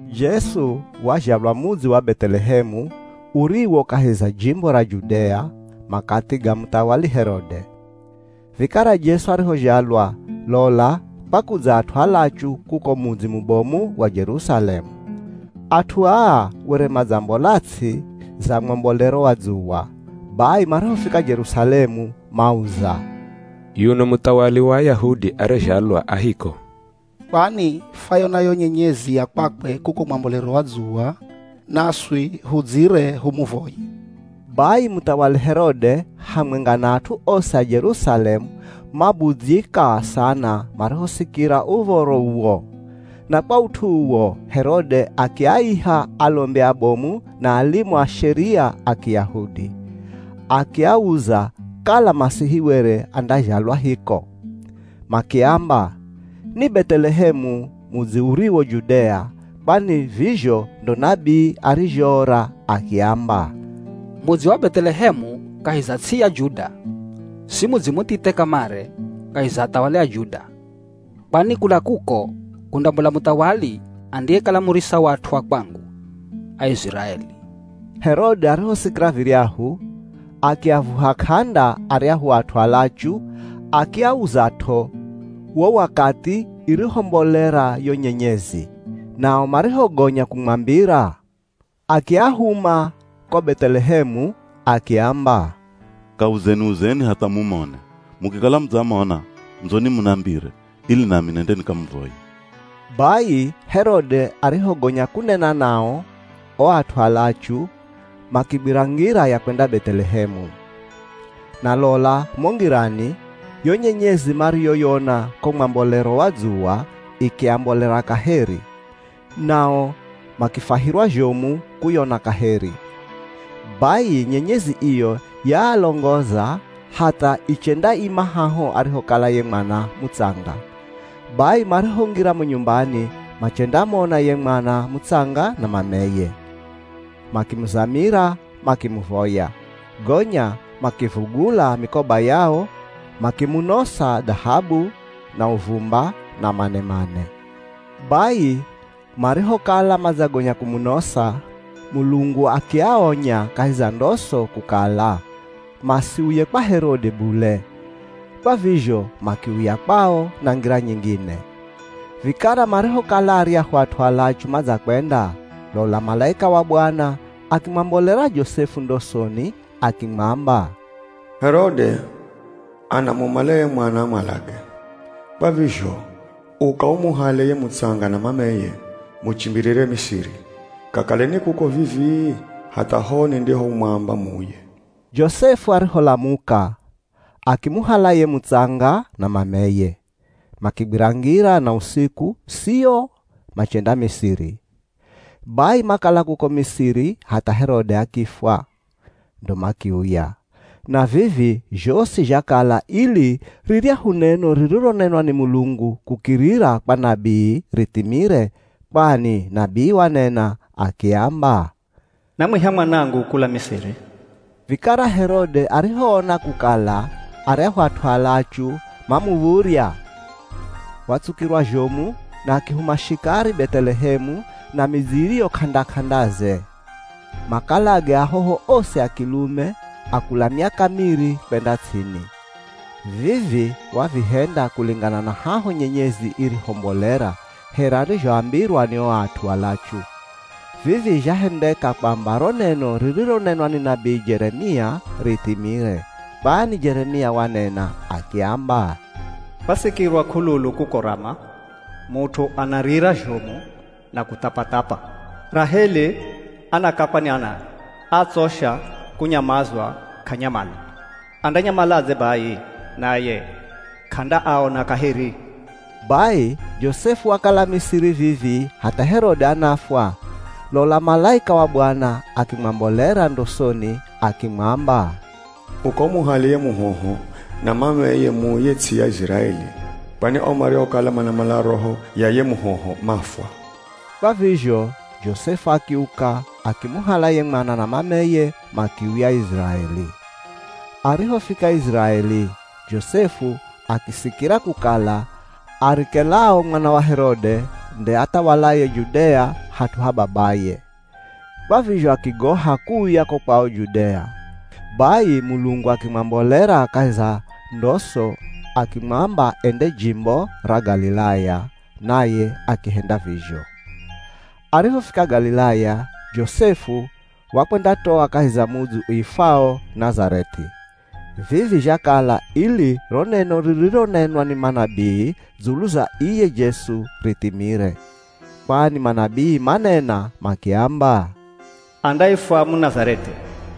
Jesu wazhalwa mudzi wa Beth'elehemu, uriwo kahi za jimbo ra Judea, makathi ga muthawali Herode. Vikara Jesu arihozhalwa, lola kwakudza at'u alachu kuko mudzi mubomu wa Jerusalemu. At'u aa were madzambola ts'i za mwambolero wa dzuwa. Bai marihofika Jerusalemu mauza, “Yuno muthawali wa Ayahudi ariyezhalwa a hiko? Kwani fwayona yo nyenyezi ya kwakwe kuko mwambolero wa dzuwa, naswi hudzire humuvoye.” Bai muthawali Herode hamwenga na at'u osi a Jerusalemu mabudzyika sana marihosikira uv̱oro uwo. Na kwa ut'u uwo, Herode akiaiha alombi abomu na alimu a Sheria a Kiyahudi, akiauza kala Masihi were andazhalwa hiko. Makiamba, ni Beth'elehemu, mudzi uriwo Judea. Kwani vizho ndo nabii arizhoora akiamba, “Mudzi wa Beth'elehemu kahi za ts'i ya Juda, si mudzi muthithe kamare kahi za athawali a Juda; kwani kula kuko kundambola muthawali andiyekala murisa wa at'u a kwangu, Aiziraeli.” Herode arihosikira viryahu, akiavuha k'anda aryahu at'u alachu akiauzat'o wo wakathi irihombolera yo nyenyezi. Nao marihogonya kumwambira, akiahuma ko Beth'elehemu, akiamba, “Kauzeni-uzeni hatha mumone. Mukikala mudzamona, ndzoni munambire, ili nami nende nikamuvoye.” Bai Herode arihogonya kunena nao, o at'u alachu makigwira ngira ya kwenda Beth'elehemu. Na lola mo ngirani, yo nyenyezi mariyoyona ko mwambolero wa dzuwa ikiambolera kaheri, nao makifwahirwa zhomu kuyona kaheri. Bai nyenyezi iyo yaalongoza hatha ichendaima haho arihokala ye mwana mutsanga. Bai marihongira mo nyumbani machendamona ye mwana mutsanga na mameye, makimuzamira makimuvoya. Gonya makivugula mikoba yao, makimunosa dhahabu, na uvumba, na manemane. Bai marihokala madzagonya kumunosa, Mulungu akiaonya kahi za ndoso kukala masiuye kwa Herode bule. Kwa vizho makiuya kwao na ngira nyingine. Vikara marihokala aryahu at'u alachu madzakwenda, lola malaika wa Bwana akimwambolera Josefu ndosoni akimwamba, “Herode, anamumala ye mwana amwalage. Kwa vizho, uka umuhale ye mutsanga na mameye, muchimbirire Misiri. Kakaleni kuko vivii hatha ho nindihomwamba muuye.” Josefu ariholamuka, akimuhala ye mutsanga na mameye, makigwira ngira na usiku, sio, machenda Misiri. Bai makala kuko Misiri hatha Herode akifwa, ndo makiuya. Na vivi zhosi zhakala ili riryahu neno ririronenwa ni Mulungu kukirira kwa nabii rithimire. Kwani nabii wanena akiamba, “Namwiha Mwanangu kula Misiri.” Vikara Herode arihoona kukala aryahu at'u alachu mamuv̱urya, watsukirwa zhomu na akihuma shikari Beth'elehemu na midzi iriyo k'anda-k'andaze makalage ahoho osi a kilume a kula miaka miri kwenda ts'ini. Vivi wavihenda kulingana na haho nyenyezi irihombolera, here arizhoambirwa ni o at'u alachu. Vivi zhahendeka kwamba ro neno ririronenwa ni nabii Jeremia rithimire. Kwani Jeremia wanena akiamba, “Kwasikirwa k'ululu kuko Rama; mut'u anarira zhomu na kuthapathapa, Raheli anakakwa ni anae. Atsosha kunyamazwa k'anyamala, andanyamaladze bai, naye k'andaaona kaheri?” Bai Josefu wakala Misiri vivii hatha Herode anafwa, lola malaika wa Bwana akimwambolera ndosoni akimwamba, “Uka umuhale ye muhoho na mameye muuye ts'i ya Iziraeli kwani o mariokala manamala roho ya ye muhoho mafwa.” Kwa vizho Josefu akiuka akimuhala ye mwana na mameye makiuya Iziraeli. Arihofika Iziraeli, Josefu akisikira kukala Arikelao mwana wa Herode nde athawalaye Judea hat'u ha babaye. Kwa vizho akigoha kuuya ko kwao Judea. Bai Mulungu akimwambolera kahi za ndoso akimwamba ende jimbo ra Galilaya, naye akihenda vizho. Arihofika Galilaya, Josefu wakwendatoa kahi za mudzi uifwao Nazareth'i. Vivi zhakala ili ro neno ririronenwa ni manabii dzulu za iye Jesu, rithimire. Kwani manabii manena makiamba, “Andaifwa Munazareth'i.”